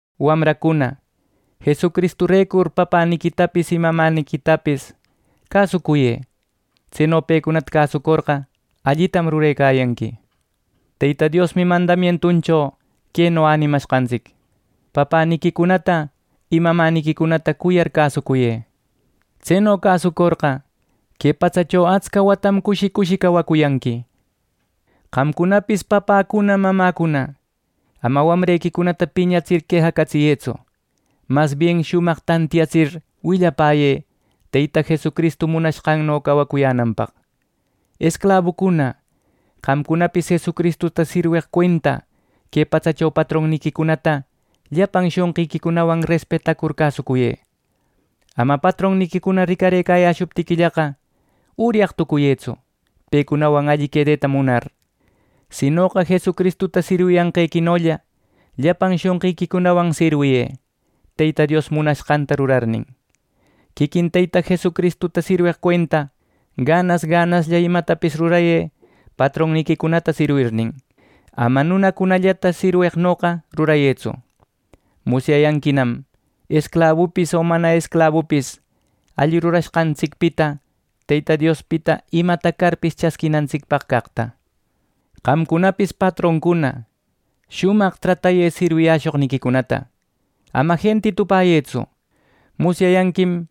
Wamracuna, Jesucristurecur papäniquitapis y mamäniquitapis cäsucuyë. Tseno pecunata cäsucorqa, allitam rurecayanqui. Teyta Diosmi mandamientuncho queno änimashqantsic: “Papäniquicunata y mamäniquicunata cuyar cäsucuyë. Tseno cäsucorqa, que patsacho atsca watam cushi cushi cawacuyanqui” nir. Qamcunapis papäcuna mamäcuna, ama wamrequicunata piñatsir quejacatsiyëtsu. Masbien shumaq tantiyatsir willapäyë Teyta Jesucristu munanqanno cawacuyänanpäq. Esclabucuna, qamcunapis Jesucristuta sirweq cuenta que patsacho patronniquicunata llapan shonqiquicunawan respetacur cäsucuyë. Ama patronniquicuna ricarëcayäshuptiquillaqa uryaq tucuyëtsu pecunawan alli quedeta munar; sinoqa Jesucristuta sirwiyanqequinolla llapan shonqiquicunawan sirwiyë, Teyta Dios munashqanta rurarnin. Quiquin Teyta Jesucristuta sirweq cuenta, ganas ganaslla imatapis rurayë patronniquicunata sirwirnin, ama nunacunallata sirweqnoqa rurayëtsu. Musyayanquinam esclabupis o mana esclabupis alli rurashqantsicpita Teyta Diospita imata carpis chasquinantsicpaq caqta. Qamcunapis patroncuna, shumaq tratayë sirwiyäshoqniquicunata. Ama jentitupäyëtsu. Musyayanquim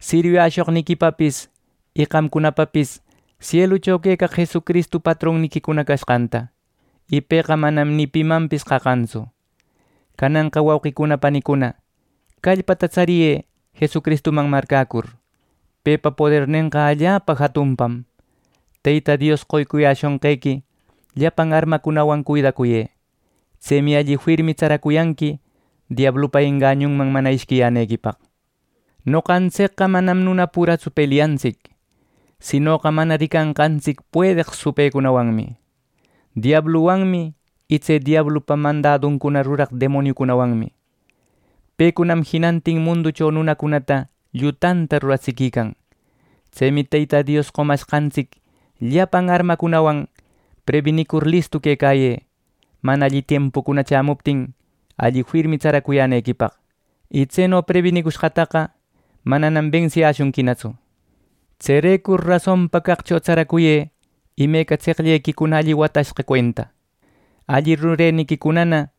sirwiyäshoqniquipapis y qamcunapapis sielucho quecaq Jesucristu patronniquicuna cashqanta, y pëqa manam ni pimanpis qaqantsu. Cananqa, wauqicuna panicuna, callpata tsariyë Jesucristuman marcäcur. Pepa podernenqa allapa jatunpam. Teyta Dios qoyäshonqequi llapan armacunawan cuidacuyë. Tsemi alli firmi tsaracuyanqui diablupa engañunman mana ishquiyänequipaq. Noqantsicqa manam nuna puratsu pelyecantsic, sinoqa mana ricanqantsic puedeq supëcunawanmi, diabluwanmi y tse diablupa mandaduncuna ruraq demoniucunawanmi. Pecunam jinantin munducho nunacunata llutanta ruratsiquican. Tsemi Teyta Dios qomashqantsic llapan armacunawan prebinicur listu quecayë, mana alli tiempucuna chämuptin alli firmi tsaracuyänequipaq. Y tseno prebinicushqataqa mananam bensiyäshunquinatsu. Tserecur rasonpa caqcho tsaracuyë imeca tseqllequicuna alli watashqa cuenta. Alli rureniquicunana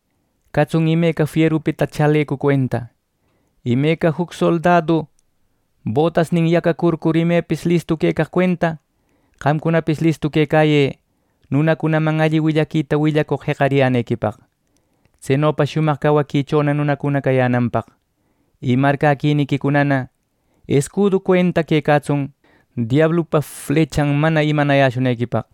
catsun imeca fierupita chalecu cuenta. Imeca juc soldadu botasnin yacacurcur, imepis listu quecaq cuenta, qamcunapis listu quecayë nunacunaman alli willaquita willapäcoq jeqariyänequipaq, tsenopa shumaq cawaquichona nunacuna cayänanpaq. Y marcäquiniquicunana escudu cuenta quecatsun diablupa flechan mana imanayäshunequipaq.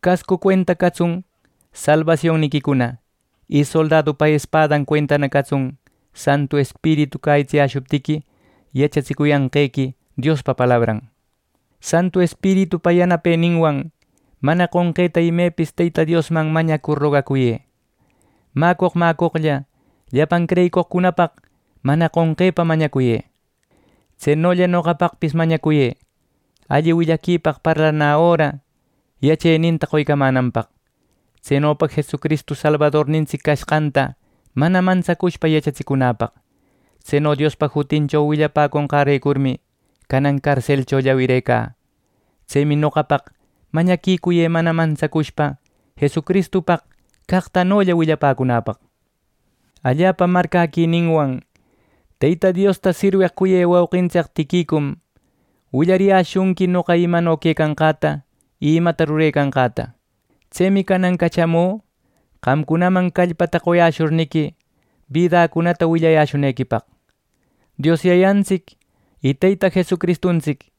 Cascu cuenta catsun salbasionniquicuna. Y soldadupa espadan cuentana catsun Santu Espiritu cäyitsiyäshuptiqui yachatsicuyanqequi Diospa palabran. Santu Espiritupa yanapeninwan mana qonqeta imepis Teyta Diosman mañacur rogacuyë. Mäcoq mäcoqlla llapan creyicoqcunapaq mana qonqepa mañacuyë. Tsenolla noqapaqpis mañacuyë alli willaquipaq parlanä öra yacheninta qoycamänanpaq. Tsenopa Jesucristu Salbadornintsic cashqanta mana mantsacushpa yachatsicunäpaq. Tseno Diospa jutincho willapäconqärecurmi canan carselcho llawirecä. Tsemi noqapaq mañaquicuyë mana mantsacushpa Jesucristupaq caqtanolla willapäcunäpaq. Allapa marcäquininwan Teyta Diosta sirweq cuyë wauqintsic Tiquicum willariyäshunqui noqa imano quecanqäta y imata rurecanqäta. Tsemi canan cachamü qamcunaman callpata qoyashurniqui, bidacunata willayäshunequipaq. Dios Yayantsic y Teyta Jesucristuntsic,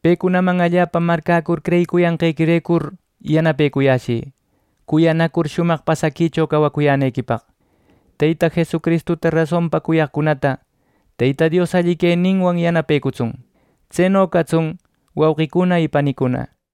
pecunaman allapa marcäcur creyicuyanqequirecur yanapecuyashï cuyanacur shumaq pasaquicho cawacuyänequipaq. Teyta Jesucristuta rasonpa cuyaqcunata Teyta Dios alli queninwan yanapecutsun. Tseno catsun, wauqicuna y panicuna.